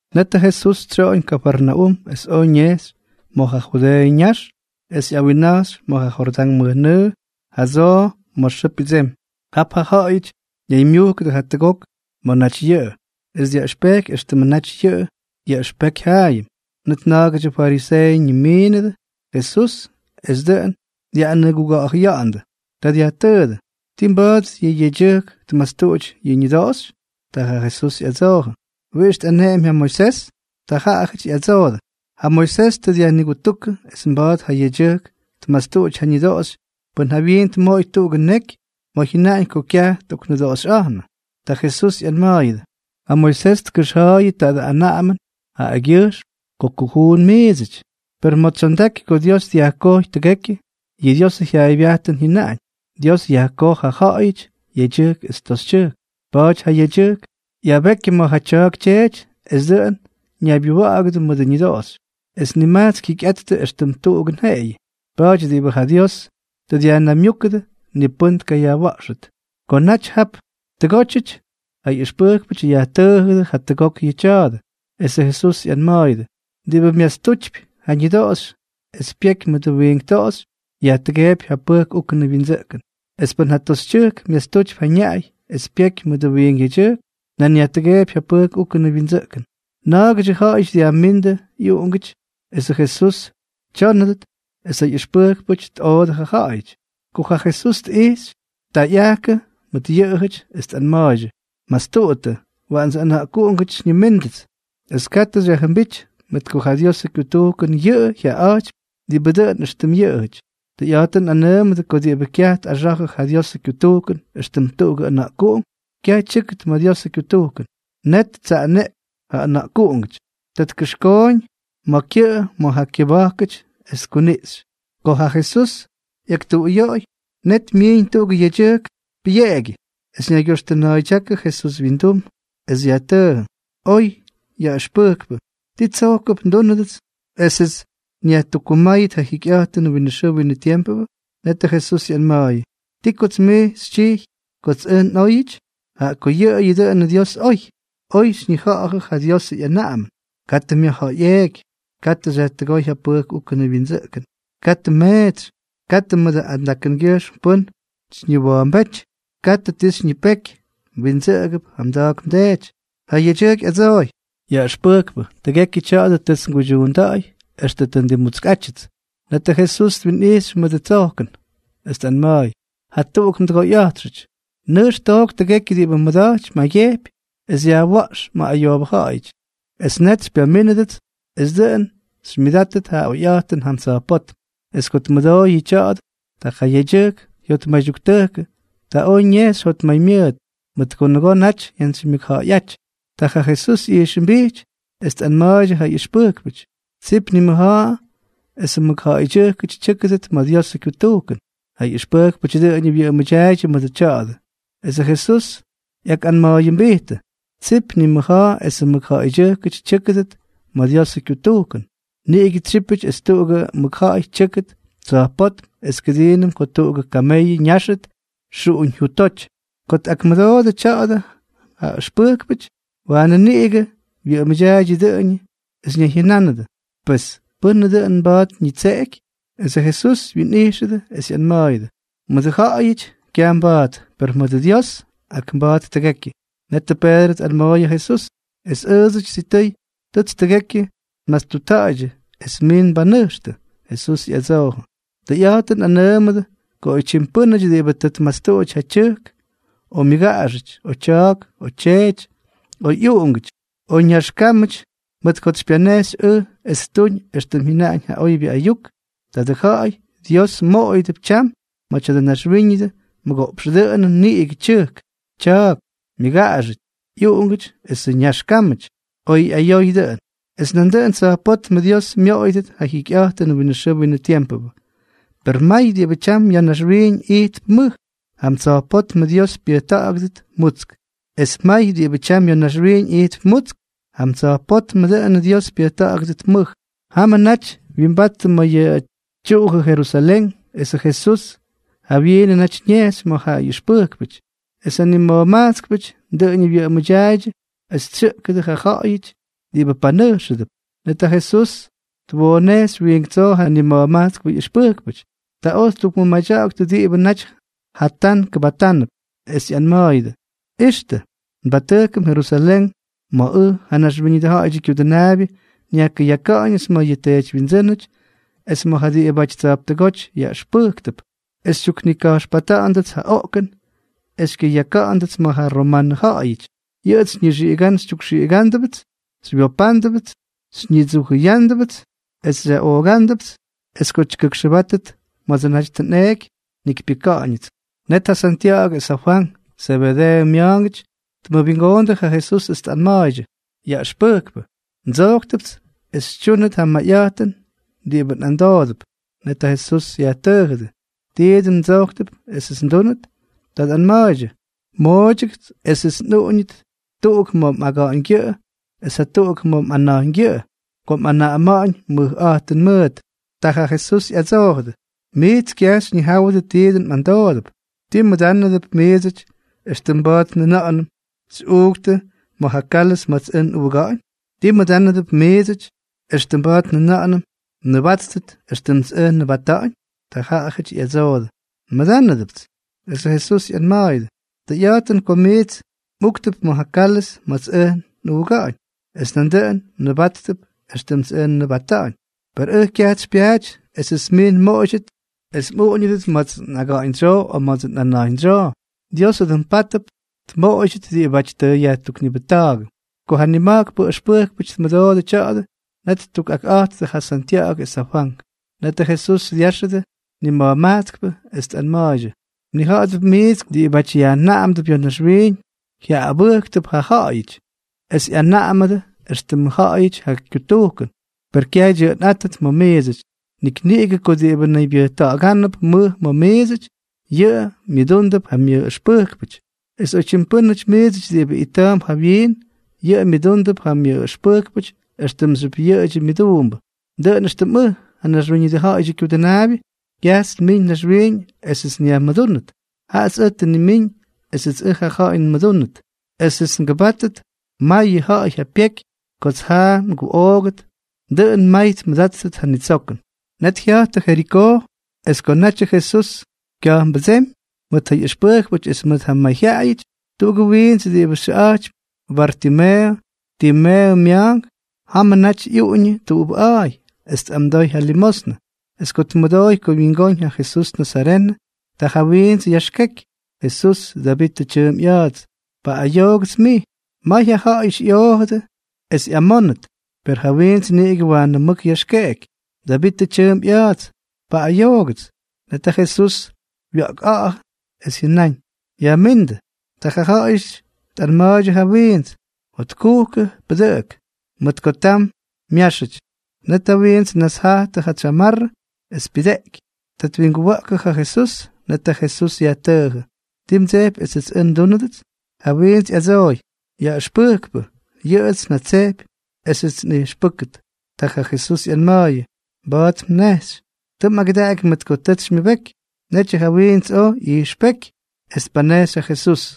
Net ja Jesús tsyoꞌoñ Kafarnaúm es oj ñejxy ma̱ ja Judeeʉ ñax es ꞌyawinna̱jxy ma̱ ja Jordán mʉjnʉʉ jadsoo ma̱ xʉʉ pyʉdsemy. Jap ja ja̱ꞌa̱yʉty ñaymyujkʉdʉ jatʉgok ma̱ naty yʉꞌʉ, es dyaꞌʉxpejky éxtʉmʉ naty yʉꞌʉ yaꞌʉxpeky jaayʉm. Net na̱a̱gʉdyʉ fariseeʉty tnimiindʉ Jesús es dʉꞌʉn dyaꞌꞌanʉguga̱ꞌa̱jʉya̱ꞌa̱ndʉ. Ta dyajtʉʉdʉ: —¿Tii mba̱a̱t yʉ yedyʉjk tmastuꞌuty ja ñʉdoꞌoxy? Ta ja Jesús ꞌyadsoojʉ: —¿Wiꞌix tꞌaneꞌemy ja Moisés? Ta jaꞌajʉty ꞌyadsoodʉ: —Ja Moisés tʉ dyajnigutúkʉ es mba̱a̱t ja yedyʉjk tmastuꞌuty ja ñʉdoꞌoxy pʉn jawyiin tmoꞌoy tuꞌugʉ neky ma̱ jyʉnaꞌañ ko kyaj tꞌoknʉdoꞌoxꞌa̱jnʉ. Ta Jesús ꞌyanma̱a̱yʉdʉ: —Ja Moisés tkʉxja̱a̱yʉ tadʉ anaꞌamʉn jaꞌagyʉjxm ko kujuun miidsʉty. Per ma̱ tsyondaky ko Dios dyajkojy tʉgekyʉ, yʉ Diosʉ jyaaybyajtʉn jyʉnaꞌañ: “Dios yajkoj ja ja̱ꞌa̱yʉty yedyʉjk es toxytyʉjk.” “Pa̱a̱ty ja yedyʉjk ꞌyabekyʉ ma̱ ja tya̱a̱k tyeety es dʉꞌʉn ñaybyuwa̱ꞌa̱gʉdʉ mʉdʉ ñʉdoꞌoxy, es nimajtsk jyikyꞌattʉ éxtʉm tuꞌugʉn jeꞌeyʉ.” Pa̱a̱ty diꞌibʉ ja Dios tʉ dyajnaymyúkʉdʉ, ni pʉ́n tkayajwa̱ꞌxʉt. Ko naty jap tʉgótyʉty, ja ꞌyʉxpʉjkpʉty yajtʉʉjʉdʉ jatʉgok yʉ tya̱a̱dʉ. Esʉ Jesús ꞌyanma̱a̱yʉdʉ: —Diꞌibʉ myastutypy ja ñʉdoꞌoxy es pyeky mʉdʉ wiink toꞌoxy, yajtʉgeepy ja pʉjk úkʉnʉ wyindsʉꞌkʉn. Es pʉn ja toxytyʉjk myastutypy ja ñaꞌay es pyeky mʉdʉ wiink yedyʉjk, nan yajtʉgeepy ja pʉjk úkʉnʉ wyindsʉꞌkʉn. Na̱a̱gʉdyʉ ja̱ꞌa̱yʉty dyajmíndʉ ꞌyʉna̱ꞌkuꞌungʉty esʉ Jesús tyónʉdʉt, es ja ꞌyʉxpʉjkpʉty tꞌoodʉ ja ja̱ꞌa̱yʉty. Ko ja Jesús tꞌijxy, ta ꞌyajkʉ mʉt yʉꞌʉjʉty es tꞌanma̱a̱ydyʉ: —Mastuꞌuttʉ, waꞌandsʉ ʉna̱ꞌkuꞌungʉty xyñimíndʉts, es katʉ xyajjʉmbíty, mʉt ko ja Diosʉ kyutujkʉn yʉꞌʉ jyaꞌaꞌa̱jtypy diꞌibʉ dʉꞌʉn éxtʉm yʉꞌʉjʉty. Tʉyꞌa̱jtʉn nꞌanʉʉmʉdʉ ko diꞌibʉ kyaj tꞌaxa̱jʉ ja Diosʉ kyutujkʉn éxtʉm tuꞌugʉ ʉna̱ꞌkuꞌunk, kyaj tyʉ́kʉt ma̱ Diosʉ kyutujkʉn. Net ttsaꞌaneꞌky ja ʉna̱ꞌkuꞌungʉty. Ta tkʉxkooñ ja kyʉꞌʉ ma̱ ja kyʉba̱jkʉty es tkuniꞌxy. Ko ja Jesús ꞌyaktuꞌuyoꞌoy, net myiiñ tuꞌugʉ yedyʉjk pʉyeꞌegyʉ, es ñaygyoxtʉna̱a̱ydyákʉ Jesús wyindum es yajtʉʉjʉ: —Oy yaꞌʉxpʉjkpʉ, ¿ti tsojkʉp ndúnʉdʉts esʉts nyajtukkumáyʉt ja jikyꞌa̱jtʉnʉ winʉ xʉʉ winʉ tiempʉ? Netʉ Jesús ꞌyanma̱a̱yʉ: —¿Ti kots mij xytyijy kots ʉj nꞌóyʉty? Jaꞌa ko yʉꞌʉyʉ dʉꞌʉnʉ Dios oy. Oy xyñija̱ꞌa̱jʉ ja Diosʉ ꞌyanaꞌamʉn: “Katʉ myajja̱ꞌa̱yꞌeeky; katʉ xyajtʉgóy ja pʉjk úkʉnʉ wyindsʉꞌkʉn; katʉ mmeetsy; katʉ mʉdʉ andakʉngyʉjxm pʉ́n xyñiwa̱a̱mbéty; katʉ ti xyñipeky; mwindsʉꞌʉgʉp ja mda̱a̱k mdeety.” Ja yedyʉjk ꞌyadsooy: —Yaꞌʉxpʉjkpʉ, tʉgekyʉ tya̱a̱dʉ tʉts nguydyuunda̱ꞌa̱y extʉ tʉ ndimmutskꞌátyʉts. Netʉ Jesús twinꞌijxy mʉdʉ tsojkʉn, es tꞌanma̱a̱y: —Jatuꞌuk mdʉgoyꞌa̱jtxʉty. Nʉjx took tʉgekyʉ diꞌibʉ mmʉda̱jty mjaygyejpy es yajwa̱ꞌx ma̱ ayoobʉ ja̱ꞌa̱yʉty, es net xypyamínʉdʉts es dʉꞌʉn xymyʉdátʉt ja oyꞌa̱jtʉn jam tsa̱jpótm. Es ko tmʉdooy yʉ tya̱a̱dʉ, ta ja yedyʉjk jyotmaydyuktʉjkʉ. Ta oj ñejxy jotmaymyʉʉt, mʉt ko nʉgoo naty jyantsymyʉkja̱ꞌa̱yʉty. Ta ja Jesús tꞌijxʉmbijty, es tꞌanma̱a̱ydyʉ ja ꞌyʉxpʉjkpʉty: —¡Tsip nimʉja̱a̱ esʉ mʉkja̱ꞌa̱ydyʉjkʉty tyʉ́kʉdʉt ma̱ Diosʉ kyutujkʉn! Ja ꞌyʉxpʉjkpʉty dʉꞌʉñʉ wyʉꞌʉmʉdyaaydyʉ mʉdʉ tya̱a̱dʉ. Esʉ Jesús ꞌyakꞌanma̱a̱yʉmbijtʉdʉ: —¡Tsip nimʉja̱a̱ esʉ mʉkja̱ꞌa̱ydyʉjkʉty tyʉ́kʉdʉt ma̱ Diosʉ kyutujkʉn! Niꞌigʉ tsyípʉty es tuꞌugʉ mʉkja̱ꞌa̱y tyʉ́kʉt tsa̱jpótm es kʉdiinʉm ko tuꞌugʉ kameyʉ ñáxʉt xuꞌuñ jutoty. Ko tꞌakmʉdoodʉ tya̱a̱dʉ ja ʉxpʉjkpʉty, waanʉ niꞌigʉ wyʉꞌʉmʉdyaaydyʉ dʉꞌʉñʉ es ñayjyʉnánʉdʉ: —Pes, ¿pʉ́nʉ dʉꞌʉn mba̱a̱t ñitseꞌeky? Esʉ Jesús wyinꞌijxʉdʉ es ꞌyanma̱a̱yʉdʉ: —Mʉdʉ ja̱ꞌa̱yʉty kyaj mba̱a̱t, per mʉdʉ Dios, ak mba̱a̱t tʉgekyʉ. Netʉ Peedrʉ tꞌanma̱a̱y ja Jesús: —Es ʉʉdsʉty sitʉy tʉts tʉgekyʉ nmastutta̱ꞌa̱ydyʉ es mij nbanʉjxtʉ. Jesús ꞌyadsoojʉ: —Tʉyꞌa̱jtʉn nꞌanʉʉmʉdʉ ko oytyim pʉ́nʉty diꞌibʉ tʉ tmastuꞌuty ja tyʉjk, o myʉga̱ꞌa̱xʉty, o tya̱a̱k, o tyeety, o ꞌyuꞌungʉty, o ñax kámʉty mʉt kots xypyanejxy ʉj es ttuñ éxtʉm jyʉnaꞌañ ja oybyʉ ayuk, tadʉ ja̱ꞌa̱y Dios moꞌoyʉdʉp tyam ma̱ tya̱dʉ naxwíñʉdʉ mʉgoꞌpx dʉꞌʉnʉn niꞌigʉ tyʉjk, tya̱a̱k, myʉgaꞌaxʉty, ꞌyuꞌungʉty esʉ ñax kámʉty, oy ꞌyayoy dʉꞌʉn; es nandʉꞌʉn tsa̱jpótm Dios myoꞌoyʉdʉt ja jikyꞌa̱jtʉnʉ winʉ xʉʉ winʉ tiempʉ. Per may diꞌibʉ tyam ya̱ naxwiiñ ijtp mʉj, jam tsa̱jpótmʉ Dios pyʉjta̱ꞌa̱gʉdʉt mutsk; es may diꞌibʉ tyam ya̱ naxwiiñ ijtp mutsk, jam tsa̱jpótmʉ Dios pyʉjta̱ꞌa̱gʉdʉt mʉj. Jamʉ naty wyimbattʉ ma̱ ja tyuꞌujʉ Jerusalén, esʉ Jesús jawyiinʉ naty ñejxy ma̱ ja ꞌyʉxpʉjkpʉty. Es ja nima̱jmajtskʉty dʉꞌʉñʉ wyʉꞌʉmʉdyaaydyʉ es tsyʉꞌkʉdʉ ja ja̱ꞌa̱yʉty diꞌibʉ panʉjxʉdʉp. Net ja Jesús twoonejxy wiink tsoo ja nima̱jmajtskpʉ ꞌyʉxpʉjkpʉty. Ta oj ttukmʉmadya̱ꞌa̱ktʉ diꞌibʉ naty jatán kʉbatánʉp, es ꞌyanma̱a̱yʉdʉ: —Ixtʉ, nbatʉjkʉm Jerusalén ma̱ ʉj, ja Naxwíñʉdʉ Ja̱ꞌa̱yʉdyʉ Kyudʉnaabyʉ, nyajkʉyaka̱ꞌa̱ñʉts ma̱ yʉ teedywyindsʉ́nʉty es ma̱ ja diꞌibʉty tsa̱jptʉgóty yaꞌʉxpʉjktʉp, es xytyuknika̱jxpata̱ꞌa̱ndʉts ja oꞌkʉn es xykyʉyaka̱ꞌa̱ndʉts ma̱ ja romanʉ ja̱ꞌa̱yʉty. Yʉꞌʉts xyñixiꞌiga̱ꞌa̱n xytyukxiꞌiga̱ꞌa̱ndʉts, xywyopa̱ꞌa̱ndʉts, xyñidsujʉya̱ꞌa̱ndʉts es xyaꞌooktʉpts, es ko tyʉgʉkxʉbátʉt ma̱dsʉ naty tʉ nꞌeeky, njikypyʉ́kʉdʉts. Net ja Santya̱ꞌa̱gʉ es ja Fwank, Zebedeeʉ mya̱a̱ngʉty, tmʉwingoondʉ ja Jesús es tꞌanma̱a̱ydyʉ: —Yaꞌʉxpʉjkpʉ, ndsojktʉpts es xytyúnʉt ja mayꞌa̱jtʉn diꞌibʉ nꞌamdoodʉp. Net ja Jesús yajtʉʉjʉdʉ: —¿Ti dʉn mdsojktʉp esʉts ndúnʉt? Ta tꞌanma̱a̱ydyʉ: —Mooydyʉgʉts esʉts nꞌuꞌuñʉdʉt tuꞌuk ma̱ mꞌaga̱ꞌa̱ñgyʉꞌʉ es jatuꞌuk ma̱ mꞌana̱jñgyʉꞌʉ ko mꞌanaꞌama̱ꞌa̱ñ mʉjꞌa̱jtʉn mʉʉt. Ta ja Jesús ꞌyadsoojʉdʉ: —Miits kyaj xyñijáwʉdʉ ti dʉn mꞌamdoodʉp. ¿Tii mmʉdánʉdʉp miidsʉty, éxtʉm mba̱a̱t njʉna̱ꞌa̱nʉm xyꞌuuktʉ ma̱ ja kálʉz ma̱ts ʉj nꞌuuga̱ꞌa̱ñ? ¿Tii mmʉdánʉdʉp miidsʉty éxtʉm mba̱a̱t njʉna̱ꞌa̱nʉm mnʉbáttʉt éxtʉmts ʉj nnʉbata̱ꞌa̱ñ? Ta jaꞌajʉty ꞌyadsoodʉ: —Nmʉdánʉdʉpts. Esʉ Jesús ꞌyanma̱a̱yʉdʉ: —Tʉyꞌa̱jtʉn ko miits mꞌuuktʉp ma̱ ja kálʉz ma̱ts ʉj nꞌuuga̱ꞌa̱ñ, es nandʉꞌʉn mnʉbáttʉt éxtʉmts ʉj nnʉbata̱ꞌa̱ñ. Per ʉj kyajts xypyaaty esʉts miits nmoꞌoydyʉt es mꞌuꞌuñʉdʉt ma̱ts nꞌaga̱ꞌa̱ñdsyoo o ma̱ts nꞌana̱jñdsyoo. Diosʉ dʉꞌʉn pátʉp tmoꞌoydyʉt diꞌibáty tʉ yajtuknibʉjta̱a̱gʉ. Ko ja nima̱jkpʉ ʉxpʉjkpʉty tmʉdoodʉ tya̱a̱dʉ, net ttukꞌakꞌa̱jttʉ ja Santya̱ꞌa̱gʉ es ja Fwank. Netʉ Jesús dyáxʉdʉ nima̱jmajtskʉty, es tꞌanma̱a̱ydyʉ: —Mnija̱ꞌa̱dʉp miits ko diꞌibáty ꞌyanaꞌamdʉp ya̱ naxwiiñ, jyaꞌꞌabʉ́ktʉp ja ja̱ꞌa̱yʉty, es ꞌyanaꞌamʉdʉ éxtʉm yʉꞌʉjʉty ja kyutujkʉn. Per kyaj dyʉꞌʉnꞌátʉt ma̱ miidsʉty. Nik niꞌigʉ ko diꞌibʉ naybyʉjta̱ꞌa̱gánʉp mʉj ma̱ miidsʉty, yʉꞌʉ myʉdúndʉp ja myʉꞌꞌʉxpʉjkpʉty, es oytyim pʉ́nʉty miidsʉty diꞌibʉ ita̱a̱mp jawyiin, yʉꞌʉ myʉdúndʉp ja myʉꞌꞌʉxpʉjkpʉty éxtʉmxyʉp yʉꞌʉdyʉ myʉduumbʉ. Dʉꞌʉn éxtʉm ʉj, ja Naxwíñʉdʉ Ja̱ꞌa̱yʉdyʉ Kyudʉnaabyʉ, kyajts nmiiñ naxwiiñ esʉts nyajmʉdúnʉt, jaꞌats ʉj tʉ nnimíñ esʉts ʉj ja ja̱ꞌa̱y nmʉdúnʉt esʉts ngʉbátʉt mayʉ ja̱ꞌa̱y ja pyeky kots jaꞌa nguꞌoogʉt, dʉꞌʉn may tmʉdáttʉt ja nitsokʉn. Net jya̱jttʉ Jerikoo. Es ko natyʉ Jesús kya̱jpnbʉdsémy mʉt ja ꞌyʉxpʉjkpʉty es mʉt ja mayjyaꞌayʉty, tuꞌugʉ wiints diꞌibʉ xyʉꞌa̱jtypy Bartimeeʉ, Timeeʉ mya̱a̱nk, jamʉ naty ꞌyuꞌuñʉ tuꞌubʉꞌa̱a̱y es tꞌamdoy ja limosnʉ. Es ko tmʉdooy ko wyingóñ ja Jesús nazarenʉ, ta ja wiints yaxkeky: —¡Jesús, Davitʉ tyʉʉmp ꞌya̱a̱ts, paꞌꞌayoogʉts mij! May ja ja̱ꞌa̱yʉty ꞌyoojʉdʉ es ꞌyamónʉt, per ja wiints niꞌigʉ waanʉ mʉk yaxkeky: —¡Davitʉ tyʉʉmp ꞌya̱a̱ts, paꞌꞌayoogʉts! Net ja Jesús wya̱ꞌkꞌa̱ꞌa̱jʉ, es jyʉnáñ: —Yajmíndʉ. Ta ja ja̱ꞌa̱yʉty tꞌanma̱a̱ydyʉ ja wiints: —Jotkujkʉ, pʉdʉꞌʉk, mʉt ko tam myáxʉty. Net ja wiints tnasjajtʉ ja tsyamarrʉ, es pyujteꞌky. Ta twinguwa̱ꞌkʉ ja Jesús. Net ja Jesús yajtʉʉjʉ: —¿Ti mdsejpy esʉts ʉj ndúnʉdʉts? Ja wiints ꞌyadsooy: —Yaꞌʉxpʉjkpʉ, yʉꞌʉts njatsejpy esʉts nꞌijxpʉ́kʉt. Ta ja Jesús ꞌyanma̱a̱yʉ: —Mba̱a̱t mnejxy. Tʉ mꞌagʉdaꞌaky mʉt ko tʉts xymyʉbeky. Netyʉ ja wiints oj ꞌyijxpéky, es tpanejxy ja Jesús.